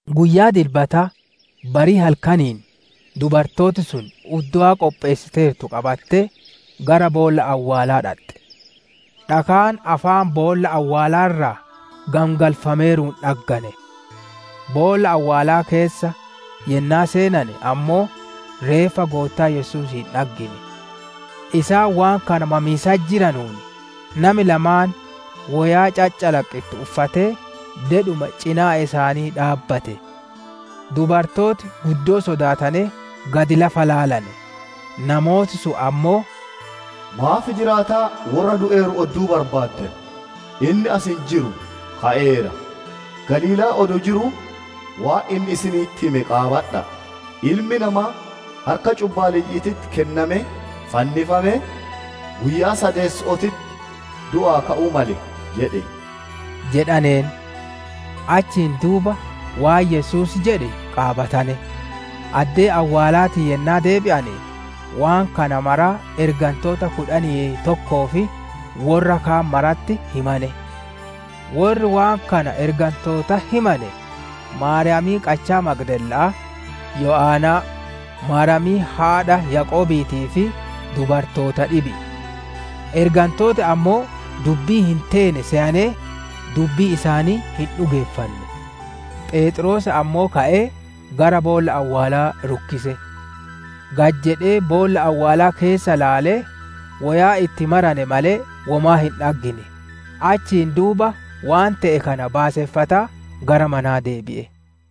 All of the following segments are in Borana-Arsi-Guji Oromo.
Guyyaa Dilbataa barii halkaniin dubartooti sun uddowaa qopheessiteertu qabattee gara boolla awwaalaa dhaxxe. Dhakaan afaan boolla awwaalaa irraa gangalfameeruun dhaggane. Boolla awwaalaa keessa yennaa seenane ammoo, reeffa Goottaa Yesuusii hin dhaggine. Isaan waan kana mamiisatti jiranuun, nami lamaan woyaa caccalaqqittu uffatee dedhuma cinaa isaanii dhaabbate. Dubartooti guddoo sodaatanee gad lafa ilaalane; namooti sun ammoo, «Maaf jiraataa worra du'eeru odduu barbaaddan? Inni as hin jiru, ka'eera. Galiilaa adoo jiruu waan inni isinitti hime qaabadha'a! ‹Ilmi namaa harka cubbaalleyyi'iititti kennamee, fannifamee, guyyaa sadeesso'ootitti du'aa ka'uu male› jedhe» jedhaneen. Achiin duuba waan Yesuus jedhe qaabatane. Addee awwaalaatii yennaa deebi'ane, waan kana maraa ergantoota kudhanii tokkoo fi worra kaan maratti himane. Worri waan kana ergantootatti himane, Maariyaamii qachaa Magdalaa, Yo'anaa, Maariyaamii haadha Yaaqoobiitii fi dubartoota dhibi'i. Ergantooti ammoo dubbii hin teene seyanee, dubbii isaanii hin dhugeeffanne. Pheexroos ammoo ka'ee gara boolla awwaalaa rukkise. Gad jedhee boolla awwaalaa keessa ilaalee, woyaa itti marane malee womaa hin dhaggine. Achiin duuba waan te'e kana baaseffataa gara manaa deebi'e.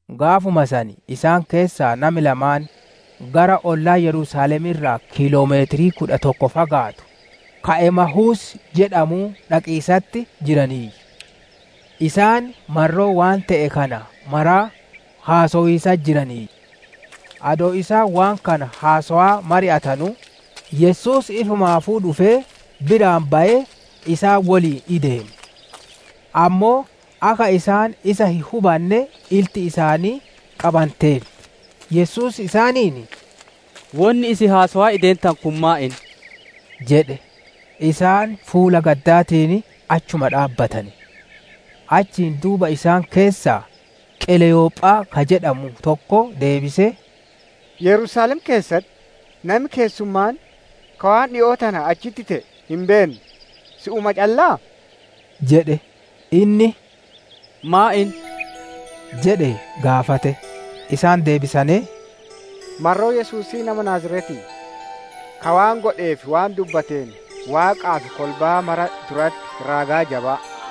Gaafuma san isaan keessaa nami lamaan gara ollaa Yerusaalemii irraa kiiloo meetira kudha tokko fagaatu, ka Emahuus jedhamuu dhaqiisatti jiraniiyyu. Isaan marroo waan te'e kana maraa haasowiisatti jiraniiyyu. Adoo isaan waan kana haasowaa mari'atanuu, Yesuus ifumaafuu dhufee biraan bayee, isaan woliin ideeme. Ammoo akka isaan isa hin hubanne, ilti isaanii qabanteerti. Yesuus isaaniin, «Wonni isin haasowaa ideentanu kun maan inni?» jedhe. Isaan fuula gaddaatiin achuma dhaabbatane. Achiin duuba isaan keessaa Qileyophaa ka jedhamu tokko deebisee, «Yerusaalem keessatti nami keessummaan ka waan dhikoo tana achitti te'e hin beenne, si'uma calla'aa?» jedhe. Inni, «Maan inni?» jedhee gaafate. Isaan deebisanee, «Marroo Yesuusii nama Naaziretii, ka waan godhee fi waan dubbateen Waaqaa fi kolbaa mara duratti raagaa jabaa,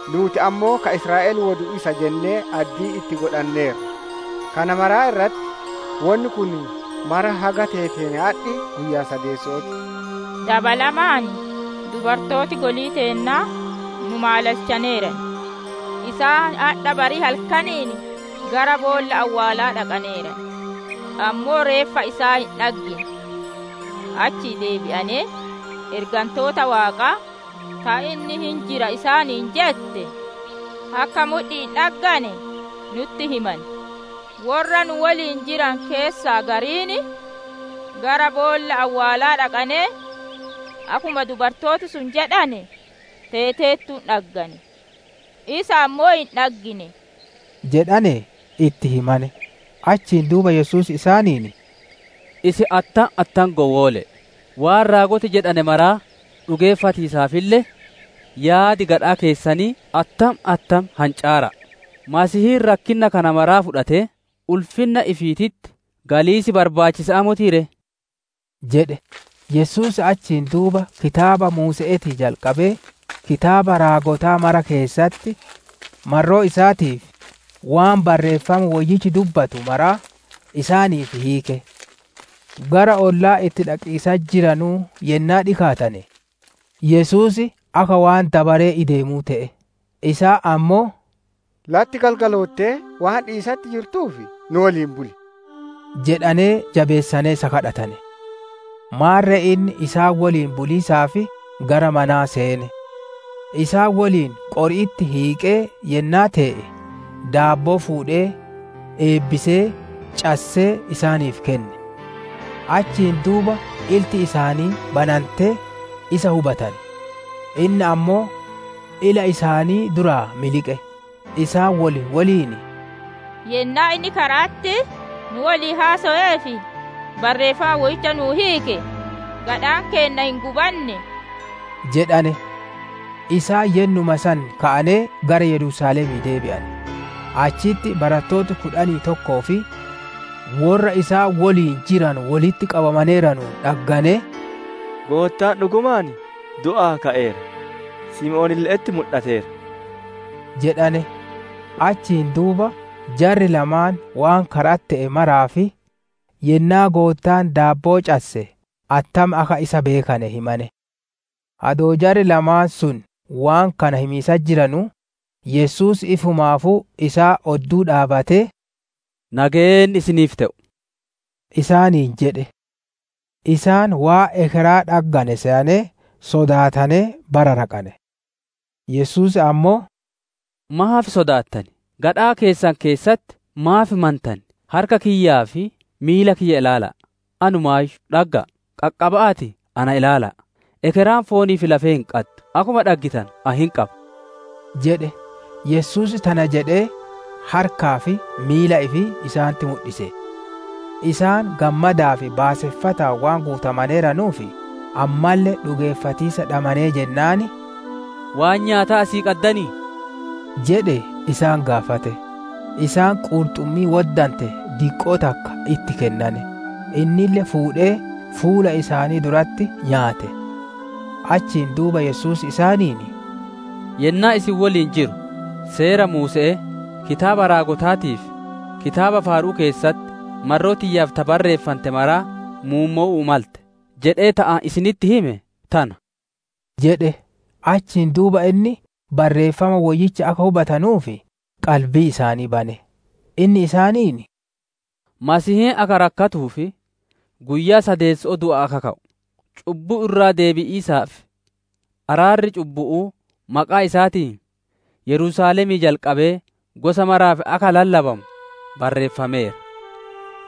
Nuuti ammoo ka Israa'el wodu isa jennee addii itti godhanneerra. Kana maraa irratti, wonni kun mara haga teeteen adhi guyyaa sadeesso'oo ti. Dabalamaan, dubartooti golii teennaa nu maalalchaneeran; isaan adha barii halkaniin gara boolla awwaalaa dhaqaneeran; ammoo reeffa isaa hin dhaggine. Achii deebi'anee, ergantoota Waaqaa ta, ‹Inni hin jira› isaaniin jette akka mudhi'iin dhaggane nutti himane. «Worra nu woliin jiranu keessaa gariin gara boolla awwaalaa dhaqanee, akkuma dubartooti sun jedhane teeteertuun dhaggane; isa ammoo hin dhaggine» jedhanee itti himane. Achiin duuba Yesuus isaaniin, «Isin attam attam gowwoole'e, waan raagoti jedhane maraa dhugeeffatiisaafille yaadi gadhaa keessanii attam attam hancaara'a! Masiihiin rakkinna kana maraa fudhatee ulfinna ifiititti galiisi, barbaachisa'aa motii ree?» jedhe. Yesuus achiin duuba kitaaba Muuse'eetii jalqabee kitaabota raagotaa mara keessatti, marroo isaatiif waan Barreeffam Woyyichi dubbatu maraa isaaniif hiike. Gara ollaa itti dhaqiisatti jiranuu yennaa dhikaatane, Yesuus akka waan dabaree ideemuu te'e. Isaan ammoo, «Latti galgaloottee, waan dhiyiisatti jirtuuf, nu woliin buli!» jedhanee jabeessanee isa kadhatane. Maarre inni isaan woliin buliisaaf gara manaa seene. Isaan woliin qori'itti hiiqee yennaa tee'e, daabboo fuudhee eebbisee, cassee isaaniif kenne. Achiin duuba ilti isaanii banantee, isa hubatane; inni ammoo ila isaanii duraa miliqe. Isaan wol woliin, «Yennaa inni kara'atti nu woliin haasowee fi Barreeffama Woyyicha nu'uuf hiike, gadhaan keenna hin gubannee?» jedhane. Isaan yennuma san ka'anee gara Yerusaalemii deebi'ane. Achitti barattoota kudhanii tokkoo fi worra isaan woliin jiranu wolitti qabamaneeranuun dhagganee, «Goottaan dhugumaan du'aa ka'eera, Simoonille'etti mudhateera!» jedhane. Achiin duuba jarri lamaan waan kara'atti te'e maraa fi yennaa Goottaan daabboo casse attam akka isa beekane himane. Adoo jarri lamaan sun waan kana himiisatti jiranuu, Yesuus ifumaafuu isaan odduu dhaabbatee, «Nageenni isiniif te'u!» isaaniin jedhe. Isaan waan ekeraa dhaggane seyanee, sodaatanee bararaqane. Yesuus ammoo, «Maaf sodaattan? Gadhaa keessan keessatti maaf mantan? Harka kiyyaa fi miila kiyya ilaala'a, anumaayyuu dhagga'a. Qaqqaba'aatii na ilaala'a; ekeraan foonii fi lafee hin qaddu, akkuma dhaggitanu ani hin qaba» jedhe. Yesuus tana jedhee harkaa fi miila ifii isaanitti mudhise. Isaan gammadaa fi baaseffataan waan guutamaneeranuuf ammalle dhugeeffatiisa dhabanee jennaan, «Waan nyaataa asii qaddanii?» jedhee isaan gaafate. Isaan qurxummii woddante diqqoo takka itti kennane; innille fuudhee fuula isaanii duratti nyaate. Achiin duuba Yesuus isaaniin, «Yennaa isin woliin jiru, Seera Muuse'ee, Kitaaba Raagotaatii fi Kitaaba Faaru'uu keessatti marroo tiyyaaf ta barreeffante maraa muummowu'uu malte, jedhee ta ani isinitti hime tana» jedhe. Achiin duuba inni Barreeffama Woyyicha akka hubatanuuf qalbii isaanii bane. Inni isaaniin, «Masiihiin akka rakkatuu fi guyyaa sadeesso'oo du'aa akka ka'u, cubbuu irraa deebi'iisaa fi araarri cubbu'uu maqaa isaatiin Yerusaalemii jalqabee gosa maraaf akka lallabamu barreeffameera.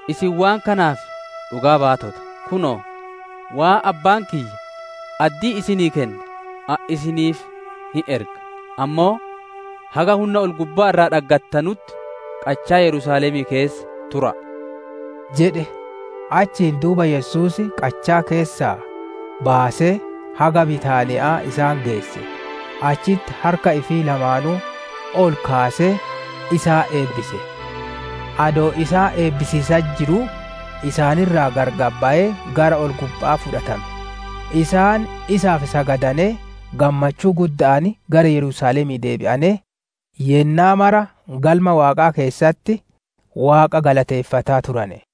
Isin waan kanaaf dhugaa-baatota. Kunoo, waan Abbaan kiyya addii isinii kenne ani isiniif hin erga; ammoo haga hunna gubbaa irraa dhaggattanutti qachaa Yerusaalemii keessa tura'a» jedhe. Achiin duuba Yesuus qachaa keessaa baasee, haga Bitaaniya'aa isaan geesse; achitti harka ifii lamaanuu ol kaasee isaan eebbise. Adoo isaan eebbisiisatti jiruu, isaan irraa gargar bayee gara ol-gubba'aa fudhatame. Isaan isaaf sagadanee, gammachuu gudda'aan gara Yerusaalemii deebi'anee, yennaa mara Galma Waaqaa keessatti Waaqa galateeffataa turane.